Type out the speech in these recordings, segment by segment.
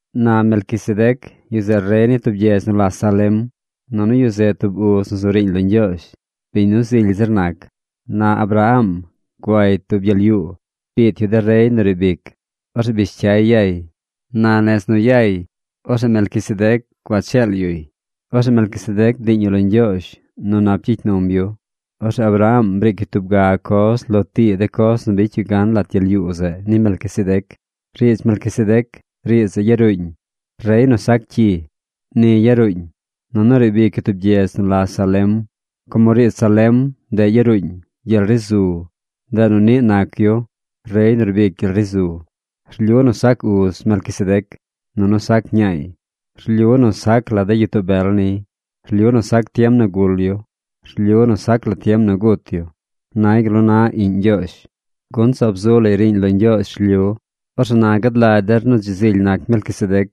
Na Melquisedec, yu zeꞌ rey ni tub gyedz nu la Salem. Nunu yu zeꞌ tub uz nu zu riiñ lo Ñgyoozh, biñ nu zily zir nac. Na Abraham guay tub gyel yuu. Biit yu de rey nu riib ic. Orzeꞌ bish cyay yay. Na nez nu yay, orzeꞌ Melquisedec gua cheel yuy. Orzeꞌ Melquisedec bdiiñ yu lo Ñgyoozh nu nap gyicy num yu. Orzeꞌ Abraham briic yu tub ga coz lo tii de coz nu bicy yu gan lat gyel yuu zeꞌ ni Melquisedec. Riidz Melquisedec, riidz zeꞌ yaruuñ: Rey nu sac cyi. Ni yaruuñ. Nunu riib ic yu tub gyedz nu la Salem. Como riidz Salem, ndeꞌ yaruuñ: Gyel ri zu, ndeꞌ nu niꞌ nac yu: Rey nu rbic gyel ri zu. Rlyu nu sac uz Melquisedec. Nunu sac ñaay. Rlyu nu sac la de gyitoo bel niy. Rlyu nu sac tiem nu gul yu. Rlyu nu sac la tiem nu gut yu. Nay gal nu na Iꞌñ Ñgyoozh, gun zaab zu lay riiñ lo Ñgyoozh rlyu. Orzeꞌ na gad lagy der nu dzi zily nac Melquisedec.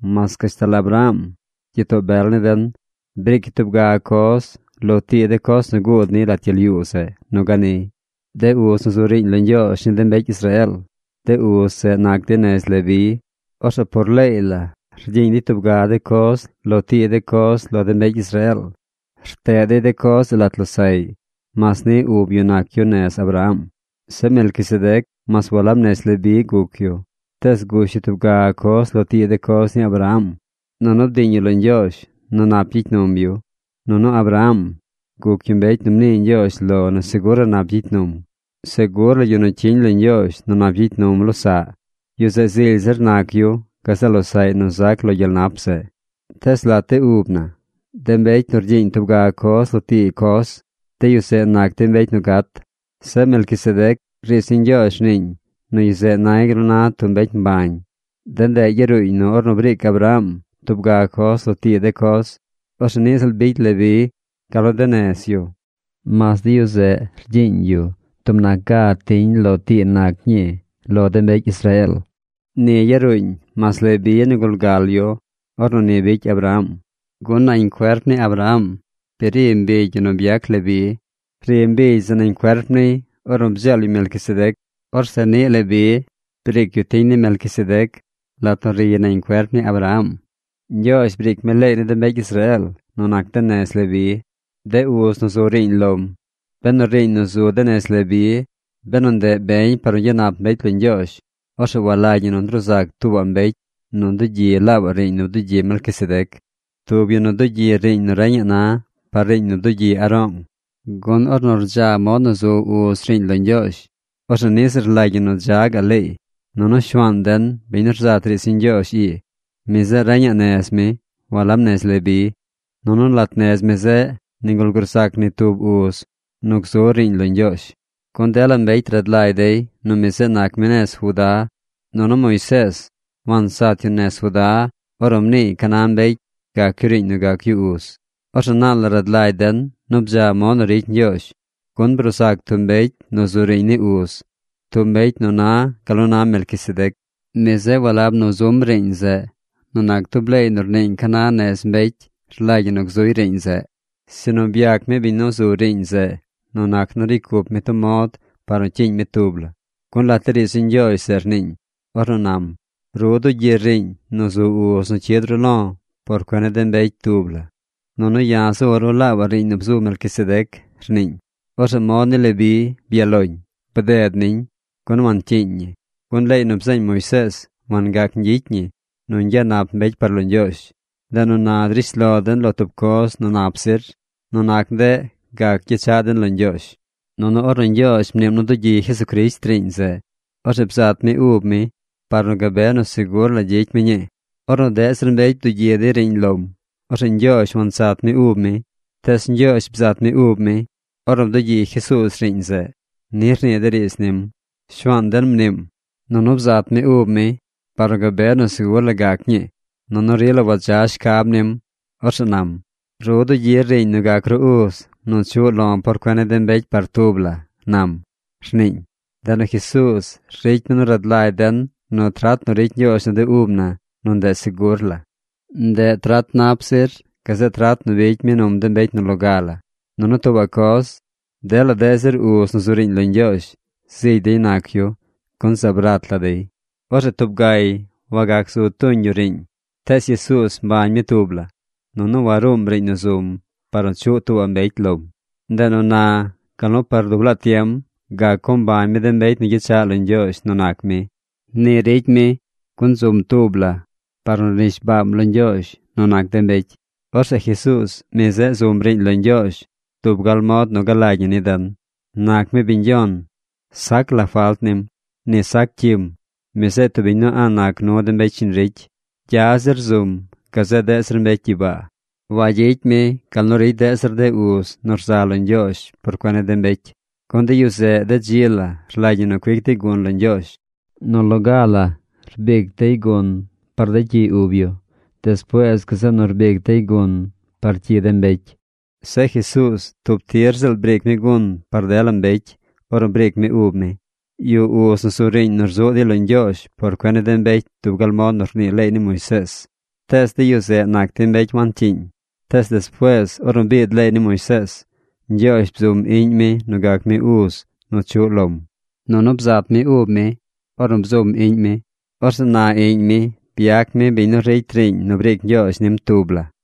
Mas gashtal Abraham, gyitoo bel ni den, briic yu tub ga coz lo tii de coz nu guud niy lat gyel yuu zeꞌ nu ganiy. De uz nu zu riiñ lo Ñgyoozh ni de mbecy Israeel, de uz zeꞌ nac dey nez Leví. Orzeꞌ por leey la rgyiiñ dey tub ga de coz lo tii de coz lo de mbecy Israeel. Rteꞌ dey de coz zeꞌ lat losaꞌy, mas niꞌ ub yu nac yu nez Abraham. Zeꞌ Melquisedec mas walab nez Leví guc yu, tees gush yu tub ga coz lo tii de coz ni Abraham. Nunu bdiiñ yu lo Ñgyoozh nu nap gyicy num yu. Nunu Abraham guc yu mbecy nu mnii Ñgyoozh lo nu segur la nap gyicy num. Segur la yu nu cyiñ lo Ñgyoozh nu nap gyicy num losaꞌ, yu zeꞌ zily zir nac yu gazeꞌ losaꞌy nu zac lo gyel nap zeꞌ. Tees lat de ub na, de mbecy nu rgyiiñ tub ga coz lo tii coz, de yu zeꞌ nac dey mbecy nu gat. Zeꞌ Melquisedec, riidz ni Ñgyoozh rniiñ nu yu zeꞌ nay gal nu na tub mbecy mbañ. De ndeꞌ yaruuñ nu ornu briic Abraham tub ga coz lo tii de coz, orzeꞌ niꞌ ziꞌl bicy Leví, gal nu de nez yu, mas de yu zeꞌ rgyiiñ dey tub nac ga tiñ lo tii nac ñii ni de mbecy Israeel. Ni yaruuñ mas Leví nigul gal yu ornu ni bicy Abraham. Gun nañ cuerp ni Abraham bi ri mbigy yu nu byac Leví. Ri mbigy zeꞌ nañ cuerp niy ornu bdzeel yu Melquisedec. Orzeꞌ niꞌ Leví briic yu tiñ ni Melquisedec lat nu riy nañ cuerp ni Abraham. Ñgyoozh briic mi leey ni de mbecy Israeel nu nac de nez Leví, de uz nu zu riiñ lom. Benu riiñ nu zu de nez Leví, benu ndeꞌ beñ par nu gyanap mbecy lo Ñgyoozh, orzeꞌ walagy ñi nu ndruu sac tuubaꞌ mbecy nu dugyi laabaꞌ riiñ nu bdugyi Melquisedec, tub yu nu dugyi riiñ nu reñaꞌ na par riiñ nu bdugyi Aroong. Gun ornu rdza mod nu zu uz riiñ lo Ñgyoozh, orzeꞌ niꞌ ziꞌl rlagy ñi nu dza gaꞌ leey. Nunu Shuaan den, biñ nu rzat riidz ni Ñgyoozh ii, mi zeꞌ reñaꞌ nez mi, walab nez Leví. Nunu lat nez mi zeꞌ nigul gruu sac ni tub uz nu gzu riiñ lo Ñgyoozh. Gun dela mbecy rad lagy dey nu mi zeꞌ nac mi nez Judá. Nunu Moisees wansat yu nez Judá ornu mniiy ca na mbecy gac yu riiñ nu gac yu uz. Orzeꞌ naal la rad lagy den nu bdza mod nu ricy Ñgyoozh, gun bruu zac tub mbecy nu zu riiñ ni uz, tub mbecy nu na gal nu na Melquisedec. Mi zeꞌ walab nu zum riiñ zeꞌ nu nac tub leey nu rniiñ ca na nez mbecy rlagy ñi nu gzuy riiñ zeꞌ, sinu byac mi biñ nu zu riiñ zeꞌ nu nac nu ricy cup mi tub mod par nu cyiiñ mi tub la. Gun lat de riidz ni Ñgyoozh zeꞌ rniiñ, ornu nam: Ru dugyir riiñ nu zu uz nu cyid ru lo̱ por cuen ni de mbecy tub la. Nunu ya̱ zu̱ ru laabaꞌ riiñ nu bzu̱ Melquisedec, rniiñ. Orzeꞌ mod ni Leví byaꞌ loñ, bded niñ, gun wancyiiñ ñi. Gun leey nu bzeeñ Moisees wangac ñgyicy ñi nu ñgyanap mbecy par lo Ñgyoozh. Ndeꞌ nu na drish lo den lo tub coz nu nap zir. Nu nac ndeꞌ gac gyechaꞌ den lo Ñgyoozh. Nunu ornu Ñgyoozh mniim nu dugyi Jesucrisht riiñ zeꞌ, orzeꞌ bzat mi ub mi par nu gabe nu segur la gyicy mi ñii. Ornu deꞌ zir mbecy bdugyi dey riiñ lom, orzeꞌ Ñgyoozh wansat mi ub mi. Tees Ñgyoozh bzat mi ub mi, ornu bdugyi Jesuuz riiñ zeꞌ. Ni rnii de riidz nim: Shuaan den mniim, nunu bzat mi ub mi par nu gabe nu segur la gac ñii. Nunu rila wadza shcab nim. Orzeꞌ nam: “Ru dugyir riiñ nu gac ru uz nu chuꞌ lo̱ por cuen ni de mbecy par tub la”, nam, rniiñ. Ndeꞌ nu Jesuuz ricy mi nu rad lagy den nu trat nu ricy Ñgyoozh nu de ub na, nu ndeꞌ segur la. Ndeꞌ trat nap zir gazeꞌ trat nu bicy mi num de mbecy nu loga la. Nunu tuubaꞌ coz. Dela deꞌ zir uz nu zu riiñ lo Ñgyoozh, zigy dey nac yu, gun zaab rat la dey. Orzeꞌ tub gay wagac zu tuñ yu riiñ. Tees Jesuuz mbañ mi tub la. Nunu waruum riiñ nu zum par nu chuꞌ tuubaꞌ mbecy lom. Ndeꞌ nu na, gal nu par dub laa tiem gac co mbañ mi de mbecy nu gyechaꞌ lo Ñgyoozh nu nac mi. Ni ricy mi, gun zum tub la par nu rnishbaam lo Ñgyoozh nu nac de mbecy. Orzeꞌ Jesuuz, mi zeꞌ zum riiñ lo Ñgyoozh dub gal mod nu galagy ñi ni den. Nac mi biñ Yon. Sac la falt nim. Ni sac cyim. Mi zeꞌ tub biñ nu a̱ꞌ nac nu de mbecy shiñ ricy. Gya zir zum gazeꞌ deꞌ zir mbecy gyibaa. Wagyicy mi gal nu ricy deꞌ zir de uz nu rza lo Ñgyoozh por cuen ni de mbecy. Gun de yu zeꞌ de dzi la rlagy ñi cuic dey gun lo Ñgyoozh. Nu loga la cuic dey gun par de cyi ub yu. Despuees gazeꞌ nu cuic dey gun par cyi de mbecy. Zeꞌ Jesuuz tub tir ziꞌl briic mi gun par dela mbecy ornu briic mi ub mi. Yuꞌ uz nu zu riiñ nu rzuꞌ dey lo Ñgyoozh por cuen ni de mbecy dub gal mod nu rnii leey ni Moisees. Tees de yu zeꞌ nac dey mbecy wancyiiñ. Tees despuees ornu biid leey ni Moisees, Ñgyoozh bzum Iꞌñ mi nu gac mi uz nu chuꞌ lom. Nunu bzat mi ub mi ornu bzum Iꞌñ mi. Orzeꞌ na Iꞌñ mi byac mi biñ nu ricy riiñ nu briic Ñgyoozh nim tub la.